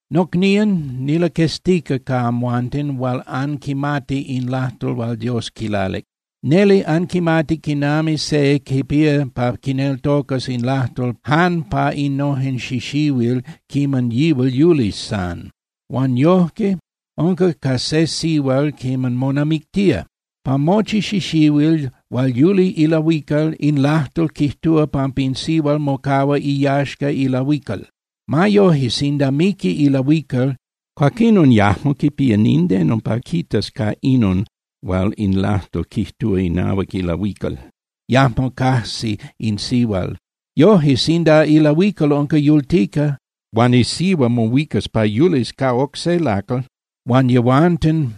Nocnían, nilaqueztica ca amhuanten hual anquimati in lajtol hual Dios quilalic. Neli anquimati quinami se quipía pa quineltocas in lajtol jan pa innojen xixihuil quiman yihual yuli san. Huan yojque unca ca se sihual quiman monamictía. Pa mochi xixihuil hual yuli ilahuical, in lajtol quijtúa pampa in sihual mocahua iyaxca ilahuical. Ma yoje, sinda miqui ilahuical, cuaquinon yajmo quipía nindeno pa quitas ca inon hual in lajtol quijtúa inahuac ilahuical, yajmo cajsi in sihual. Yoje, sinda ilahuical unca yultica, huan isihua mohuicas pa yulis ca oc se lacal huan yehuanten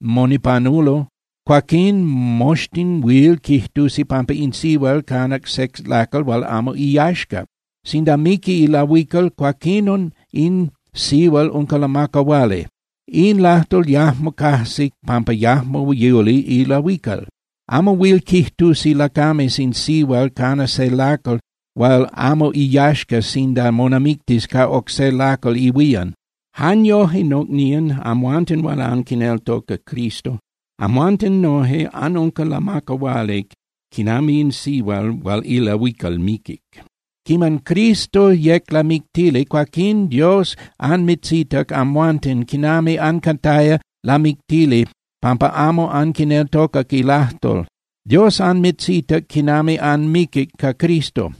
monipanulo, cuaquín moxtin huil quijtusi pampa in sihual canac se lacal hual amo iyaxca. Sinda miqui ilahuical, cuaquinon in sihual unca lamacahuali. In lajtol yajmo cajsi pampa yajmo yuli ilahuical. Amo huil quijtusi lacames in sihual cana se lacal hual amo iyaxca sinda monamictis ca oc se lacal ihuían. Jan yoje, nocnían, amhuanten hual anquineltoca Cristo, amhuanten noje anunca lamacahuali quinami in sihual hual ilahuical miquic. Quiman Cristo yec lamictili, cuaquín Dios anmitzitac amhuanten quinami ancataya lamictili pampa amo anquineltocac ilajtol. Dios anmitzitac quinami anmiquic ca Cristo.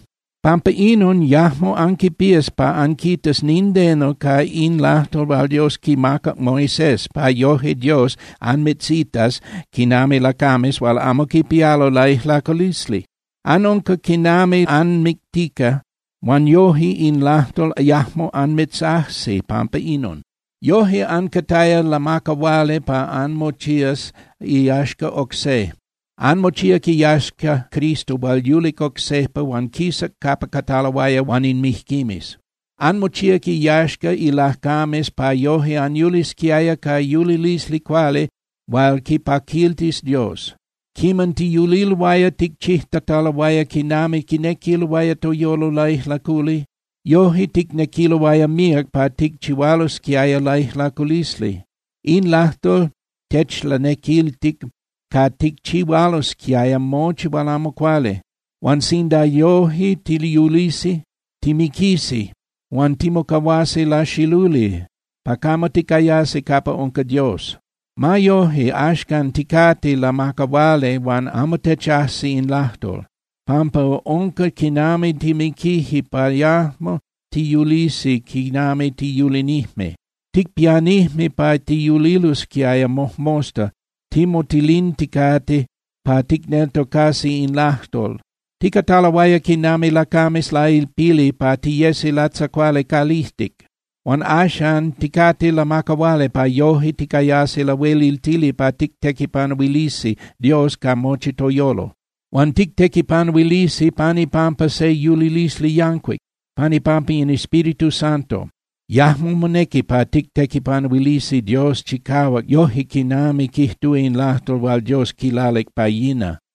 Pampa inon yajmo anquipías pa anquitas nindeno ca in lajtol hual Dios quimacac Moisés pa yoje Dios anmitzitas quinami lacames hual amo quipialo laijlaculisli. Anunca quinami anmictica huan yoje in lajtol yajmo anmitzajsi pampa inon. Yoje ancataya lamacahuali pa anmochías iyaxca oc se. Anmochíac iyaxca Cristo hual yulic oc sejpa huan quisac capa cataloaya huan in mijquimes. Anmochíac iyaxca ilacames pa yoje anyulisquiaya ca yulilisli cuali hual quipaquiltis Dios. Quiman tiyuliloaya ticchijtataloaya quinami quinequiloaya toyolo laijlaculi, yoje ticnequiloaya míac pa ticchihualosquiaya laijlaculisli. In lajtol techlanequiltic pa ticchihualosquiaya mochi hual amo cuali. Huan sinda yoje tiyulisi, timiquisi huan timocahuasi laxiluli pa camo ticayasi capa unca Dios. Ma yoje, axcan ticate lamacahuali huan amo techajsi in lajtol, pampa unca quinami timiquije pa yajmo tiyulisi quinami tiyulinijme. Ticpianijme pa tiyulilosquiaya mojmosta timotolinticate pa ticneltocasi in lajtol. Ticataloaya quinami lacames lailpili pa tiyesi latzacuali calijtic. Huan axan ticate lamacahuali pa yoje ticayasi lahueliltili pa tictequipanuilisi Dios ca mochi toyolo. Huan tictequipanuilisi pan ipampa se yulilisli yancuic, pan ipampa in Espíritu Santo. Yajmo monequi pa tictequipanuilisi Dios chicahuac yoje quinami quijtúa in lajtol hual Dios quilalic pa yina.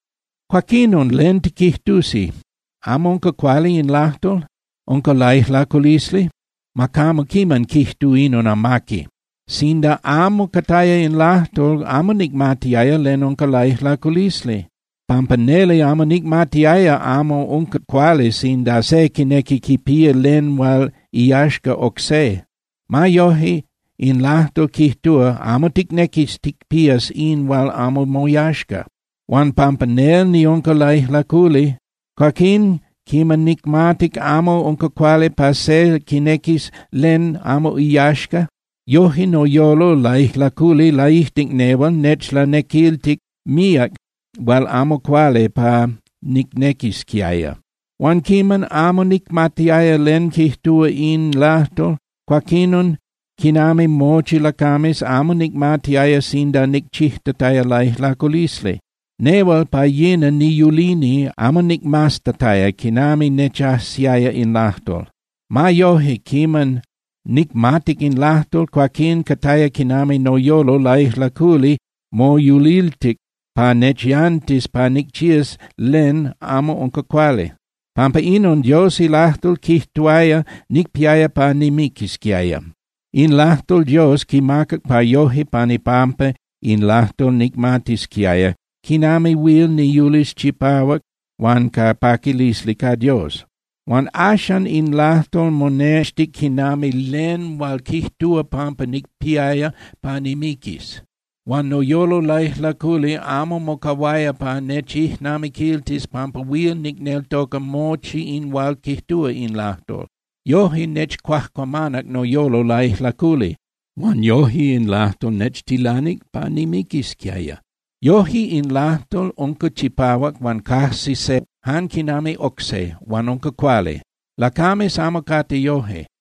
Cuaquinon ¿len tiquijtusi? ¿Amo unca cuali in lajtol? ¿Unca laijlaculisli? ¡Ma camo quiman quijtu inon amaqui! Sinda amo cataya in lajtol, amo nicmatiaya len unca laijlaculisli, pampa neli amo nicmatiaya amo unca cuali sinda se quinequi quipía len hual iyaxca oc se. Ma yoje, in lajtol quijtuaya: “Amo ticnequis ticpías in hual amo moyaxca.” Huan pampa nel niunca laijlaculi, cuaquín quiman nicmatic amo unca cuali pa se quinequis len amo iyaxca, yoje noyolo laijlaculi laijtic nehual nechlanequiltic míac hual amo cuali pa nicnequisquiaya. Huan quiman amo nicmatiaya len quijtúa in lajtol, cuaquinon, quinami mochi lacames, amo nicmatiaya sinda nicchijtataya laijlaculisli. Nehual pa yina niyulini amo nicmaztataya quinami nechajsiaya in lajtol. Ma yoje, quiman nicmatic in lajtol, cuaquín cataya quinami noyolo laijlaculi moyuliltic pa nechyantis pa nicchías len amo unca cuali. Pampa inon, Dios ilajtol quijtuaya nicpiaya pa nimiquisquiaya. In lajtol Dios quimacac pa yoje pan ipampa in lajtol nicmatisquiaya quinami huil niyulis chipahuac huan ca paquilisli ca Dios. Huan axan in lajtol monextic quinami len hual quijtúa pampa nicpiaya pa nimiquis. Huan noyolo laijlaculi amo mocahuaya pa nechijnamiquiltis pampa huil nicneltoca mochi in hual quijtúa in lajtol. Yoje nechcuajcuamanac noyolo laijlaculi. Huan yoje in lajtol nechtilanic pa nimiquisquiaya. Yoje, in lajtol unca chipahuac huan cajsi se jan quinami oc se, huan unca cuali. Lacames amo cate yoje.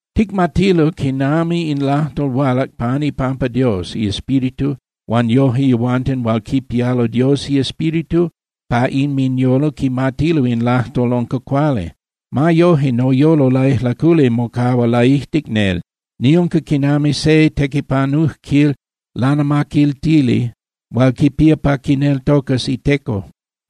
Ticmatilo quinami in lajtol hualac pan ipampa Dios iEspíritu huan yoje yehuanten hual quipialo Dios iEspíritu pa inminyolo quimatilo in lajtol unca cuali. Ma yoje, noyolo laijlaculi mocahua laijtic nel. Niunca quinami se tequipanujquil lanamaquiltili hual quipía pa quineltocas iteco.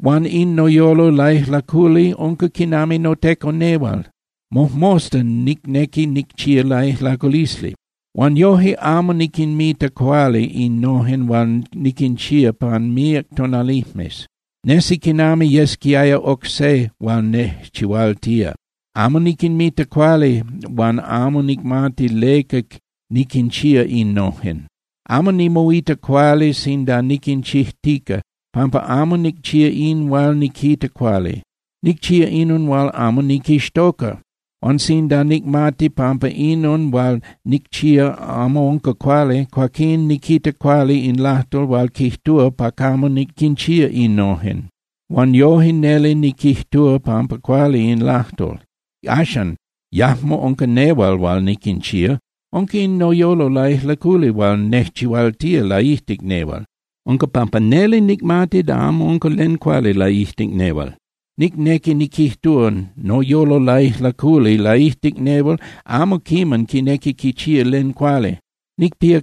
Huan in noyolo laijlaculi unca quinami noteco nehual, mojmosta nicnequi nicchía laijlaculisli. Huan yoje, amo niquinmita cuali innojen hual niquinchía pan míac tonalijmes. Nesi quinami yesquiaya oc se hual nejchihualtía. Amo niquinmita cuali huan amo nicmati leca niquinchía innojen. Amo nimoita cuali sinda niquinchijtica, pampa amo nicchía in hual niquita cuali. Nicchía inon hual amo niquixtoca. Huan sinda nicmati pampa inon hual nicchía amo unca cuali, cuaquín niquita cuali in lajtol hual quijtúa pa camo niquinchía innojen. Huan yoje neli niquijtúa pampa cuali in lajtol. Axan, yajmo unca nehual hual niquinchía, unca in noyolo laijlaculi hual nejchihualtía laijtic nehual. Unca pampa neli nicmati da amo unca len cuali laijtic nehual. Nicnequi niquijtúa, noyolo laijlaculi laijtic nehual amo quiman quinequi quichía len cuali. Nicpía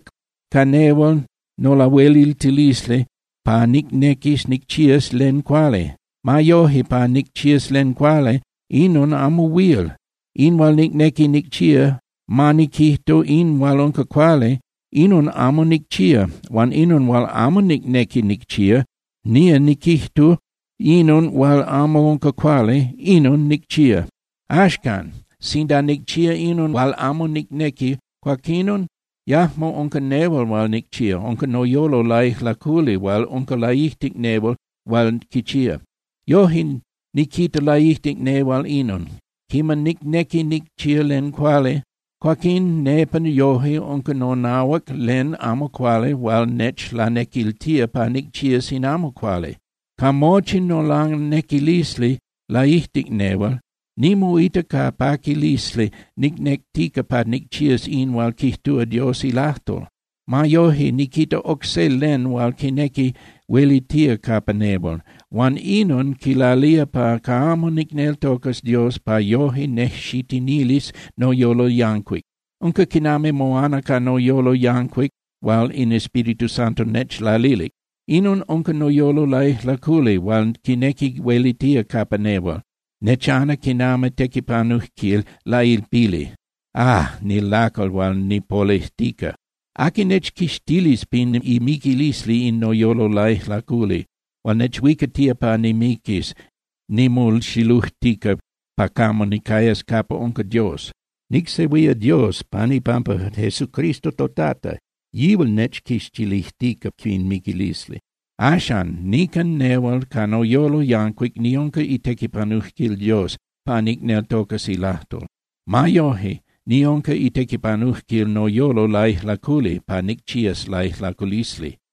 ca nehual nolahueliltilisli pa nicnequis nicchías len cuali. Ma yoje, pa nicchías len cuali, inon amo huil. In hual nicnequi nicchía, ma niquijtu, in hual unca cuali, inon amo nicchía. Huan inon hual amo nicnequi nicchía, ma niquijtu, inon hual amo unca cuali, inon nicchía. Axcan, sinda nicchía inon hual amo nicnequi, cuaquinon yajmo unca nehual hual nicchía. Unca noyolo laijlaculi hual unca laijtic nehual hual quichía. Yoje, niquita laijtic nehual inon. Quiman nicnequi nicchía len cuali, cuaquín nepa noje unca nonahuac len amo cuali hual nechlanequiltía pa nicchías in amo cuali. Ca mochi nolanequilisli laijtic nehual, nimoita ca paquilisli nicnectica pa nicchías in hual quijtúa Dios ilajtol. Ma yoje, niquita oc se len hual quinequi huelitía capa nehual, huan inon quilalía pa camo nicneltocas Dios pa yoje nejxitinilis noyolo yancuic. Unca quinami moana ca noyolo yancuic hual in Espíritu Santo nechlalilic. Inon unca noyolo laijlaculi hual quinequi huelitía capa nehual, nechana quinami tequipanujquil lailpili. ¡Ah, nilacal hual nipolejtica! ¿Aqui nechquixtilis pin imiquilisli in noyolo laijlaculi hual nechhuicatía pa nimiquis nimoxilujtica pa camo nicayas capa unca Dios? Nicsehuía Dios pan ipampa Jesucristo toTata, yihual nechquixtilijtica pin miquilisli. Axan, nican nehual ca noyolo yancuic niunca itequipanujquil Dios pa nicneltocas ilajtol. Ma yoje, niunca itequipanujquil noyolo laijlaculi pa nicchías laijlaculisli.